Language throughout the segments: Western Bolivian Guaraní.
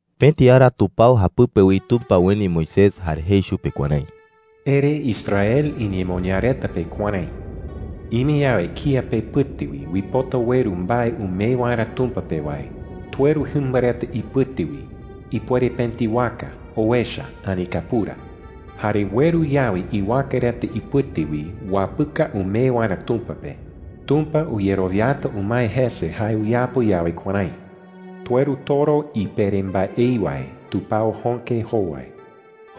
Pëti ara tupao japɨpe wi Tumpa ueni Moisés jare jei chupe kuärái: “Ere Israel iñemoñaa reta pe kuärái: ‘Ime yawe kía pepɨte wi uipota ueru mbae umee waerä Tumpa pe wae, tueru jɨmba reta ipɨte wi – ipuere pëti waka, owecha, ani kapura. ‘Jare ueru yawe iwaka reta ipɨte wi uapɨka umee waerä Tumpa pe, Tumpa uyerowiata umae jese jae uyapo yawe kuärái: Tueru toro ipere mbaei wae tupao jöke jowai.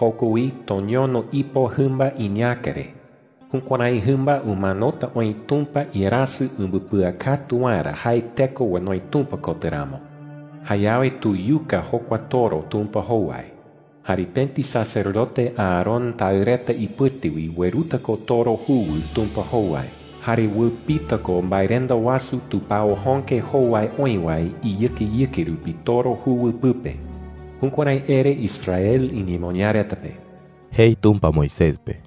Joko wi toñono ipo jɨmba iñäka re. Jukuärái jɨmba umanota oï Tumpa iarasɨ umbɨpɨakatu waerä jae teko onoi Tumpa kotɨ ramo. Jayawe tuyuka jokua toro Tumpa jowai. Jare pëti sacerdote Aarón taɨ reta ipɨte wi ueruta ko toro juwɨ Tumpa jowai. Jare uɨpita ko mbaerenda wasu tupao jöke jowai oï wae iyɨkeyɨke rupi toro juwɨ pɨpe.’ Jukuärái ere Israel iñemoñaa reta pe,” jei Tumpa Moisés pe.